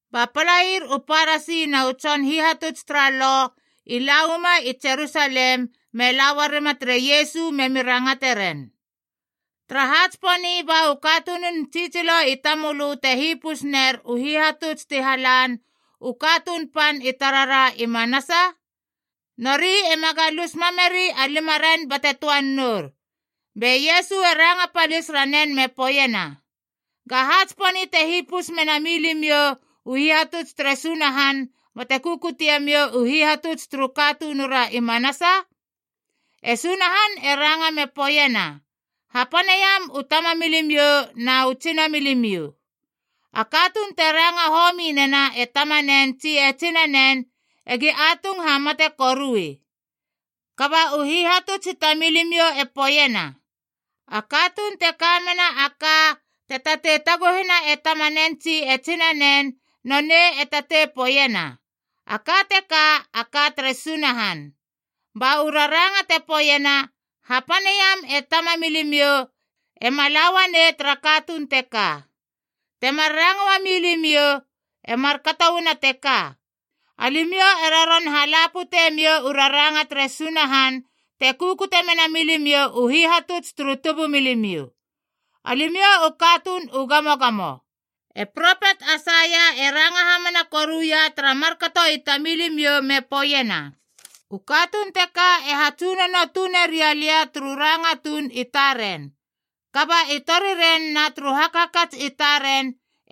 Ba palair u Parasi na u tson hihatuts tara Lo i la uama i Jerusalem me la uarima tere Iesu memi rangate ren, “Taraha tsiponi ba u katunun tsitsilo i tamölö te hipus ner u hihatuts ti halan u katuun pan i tarara i manasa? Nori ema galus mameri a limaren bate töan nour!” Be Iesu e ranga palis ranen me poeiena, “Gaha tsiponi te hipus me na mi limiou u hihatuts tere Sunahan bate kukute miou u hihatuts turu katunura i manasa? E Sunahan e ranga me poeiena, ‘Hapaneiam u tamamilimiou na u tsinamilimiou. A katuun te ranga homi nena e tamanen tsi e tsinanen egi atung hamate korui.’ Kaba u hihatuts i tamilimiou e poeiena, ‘A katuun te ka mena a ka te tatei taguhena e tamanen tsi e tsinanen, nonei e tatei poeiena, A ka teka a ka tere Sunahan.’ Ba u raranga te poeiena, ‘Hapaneiam e tamamilimiou’ ema la uanei tara katuun teka. Temar ranga uami limiou. E markato uana teka, alimiou e roron hala putemiou u raranga tere Sunahan te kukute mena milimiou u hihatuts turu tubumilimiou. Alimiou u katuun u gamogamo! E propet Aisaia e ranga hamana koruia tara markato i tamilimiou, me poeiena, ‘U katuun teka e hatsunono tune ria lia turu ranga tuun i taren, kaba i toriren na turu hakhakats i taren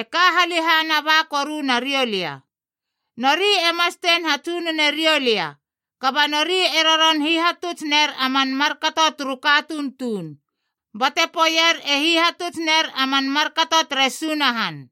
e ka halehana ba koru nariou lia. Nori e mastein hatsunone riou lia, kaba nori e roron hihatuts ner a man markato turu katuun tuun, bate poeier e hihatuts ner a man markato tere Sunahan!’”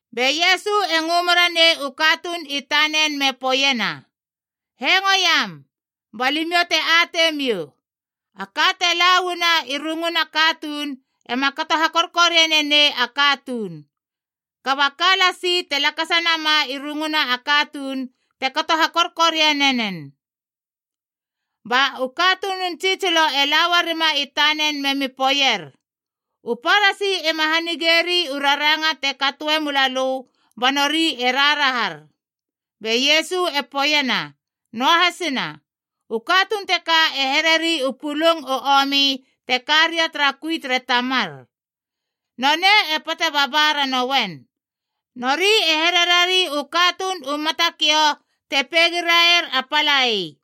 Be Iesu e ngö mera nei u katuun i tanen me poeiena, “Hengoiam, ba limiou te ateimiou! A ka te la uana i runguna katuun ema kato hakorkoriane nei a katuun. Kaba a ka lasi te lakasanama i runguna a katuun te kato hakorkoriane nen.” Ba u katunun tsitsilo e la uarima i tanen memi poeier, “U Parasi ema hanigeri u raranga te katoe mula lö ba nori e raharahar.” Be Iesu e poeiena, “Noahasina. U katuun teka e hereri u pulung u omi te ka ria tara kui tere Tamar. Nonei e pate baba ranoen. Nori e hererari u katuun u matakiou te peigiraier a palai.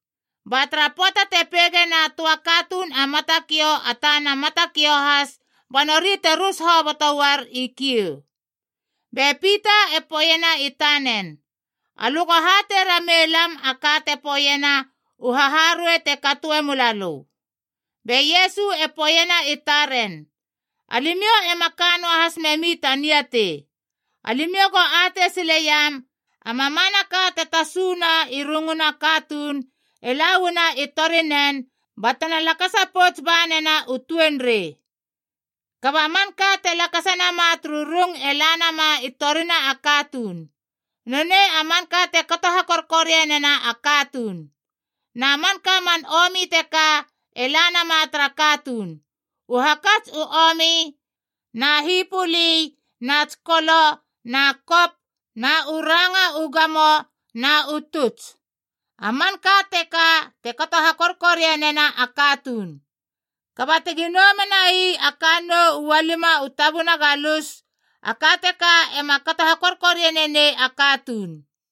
Ba tara pöata te peigena a töa katuun a matakiou a tana matakiou has ba nori te rus hoboto uar i kiou.” Be Pita e poeiena i tanen, “Alö go hatei ramei lam a ka te poeiena u haharuei te katoe mula lö.” Be Iesu e poeiena i taren, “Alimiou ema ka noahas memi ta niatei. Alimiou go atei sileiam, a mamanaka te tasuna i runguna katuun e la uana i torinen batena lakasa ba pouts banena u tuenrei. Kaba manka te lakasa nama turu rung e la nama i torina a katuun. Nonei a manka te kato hakorkorianena a katuun. Na manka man omi teka e la nama tara katuun: u hakats u omi na hipöli na tsikolo na kop na u ranga u gamo, na u tuts. A manka teka te kato hakorkorianena a katuun. Kaba tegi nou menai a kannou ualima u tabuna galus, a ka teka ema kato hakorkoriane nei a katuun.”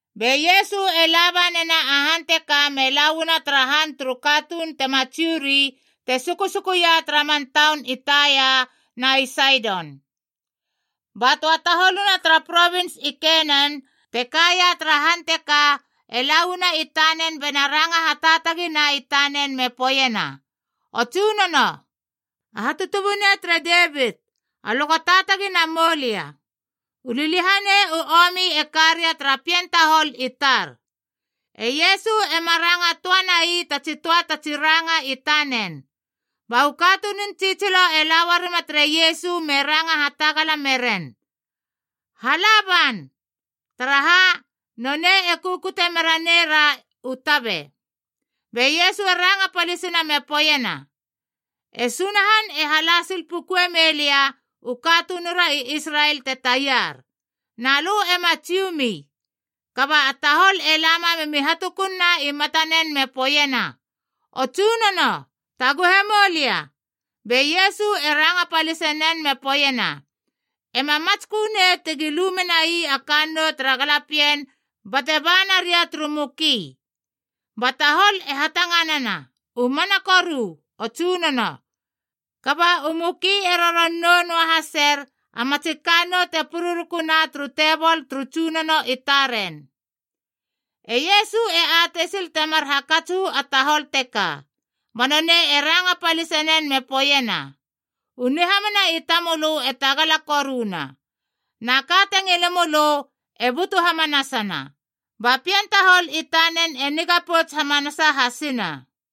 Be Iesu e la ba nena a han teka me la uana tara han turu katuun tema Jiu ri te sukusukuia tara man taun i Taia na i Saidon. Ba töa taholuna tara provins i Kenan te kaia tara han teka e la uana i tanen bena ranga hataatagina i tanen me poeiena, “O Tsunono, a Hatutubunei tere Devit! Alö go taatagi namou lia! U liliahanei u omi e karia tara pien tahol i tar!” E Iesu ema ranga töa nai tatsi töa tatsi ranga i tanen. Ba u katunun tsitsilo e la uarima tere Iesu me ranga hatagala meren, “Hala ban! Taraha, nonei e kukute mera neira u tabe.” Be Iesu e ranga palisina me poeiena, “E Sunahan e hala sil puku me melia u katunura i Israel te taiar. Na lö ema Jiu mi.” Kaba a tahol e lama memi hatukunna i matanen me poeiena, “O Tsunono, taguhe moulia!” Be Iesu e ranga palisenen, me poeiena, “E ma matskö nei tegi lu menai a kannou tara galapien bate ba naria turu muki.” Ba tahol e hatanganana, “U mana koru, o Tsunono. Kaba u muki e roron nou noa haser a matsi kannou te pururukuna turu tebol turu Tsunono i taren.” E Iesu e atei sil temar hakats uu a tahol teka. Ba Nonei e ranga palisenen me poeiena, “U nihamana i tamölö e tagala koruna. Na ka te ngile mölö e butu hamanasana.” Ba pien tahol i tanen e niga pouts hamanasa hasina.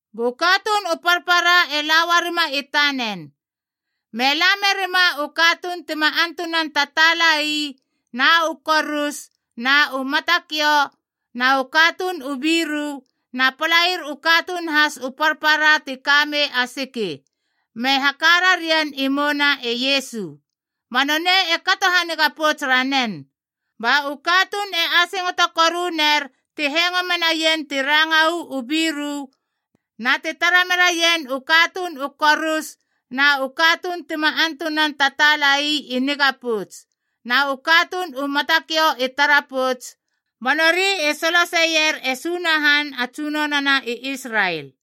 Bu katuun u parpara e la uarima i tanen, me la merima u katuun ti ma antunan tataalai, na u korus, na u matakiou, na u katuun u biru, na palair u katuun has u parpara ti kamei a siki, me haka rarien i mouna e Iesu. Ba nonei e kato haniga pouts ranen. Ba u katuun e asingoto koruner ti hengo menaien ti ranga uu biru, na ti tara meraien u katuun u korus na u katuun tima antunan tataalai i niga pouts, na u katuun u matakiou i tara pouts. Ba nori i soloseier e Sunahan a Tsunonona i Israel.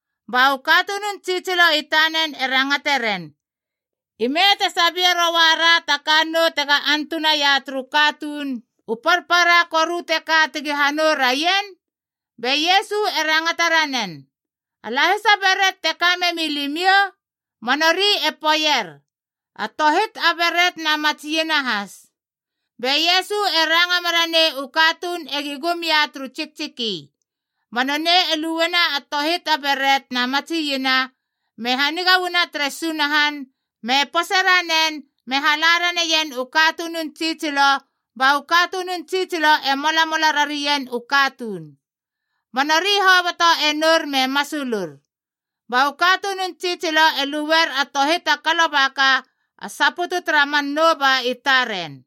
Ba u katunun tsitsilo i tanen e rangate ren, “Ime te sabie roara ta kannou tega antunaia turu katuun u parpara koru teka tegi hanou raien?” Be Iesu e rangata ranen, “A lahisa beret te ka memi limiou?” Ba nori e poeier, “A tohit a beret na matsi iena has.” Be Iesu e ranga mera nei u katuun egi gum ia turu tsiktsiki. Ba nonei e luena a tohit a beret na matsi iena, me haniga uana tere Sunahan, me pose ranen me hala raneien u katunun tsitsilo, ba u katunun tsitsilo e molamola rarien u katuun. Ba nori hoboto e nour me masulur. Ba u katunun tsitsilo e luer a tohit a kalobaka a saputu tara man nouba i taren.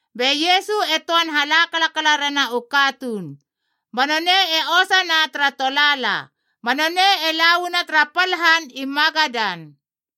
Be Iesu e töan hala kalakala rena u katuun, ba nonei e osana tara tolaala, ba nonei e la uana tara pal han i Magadan.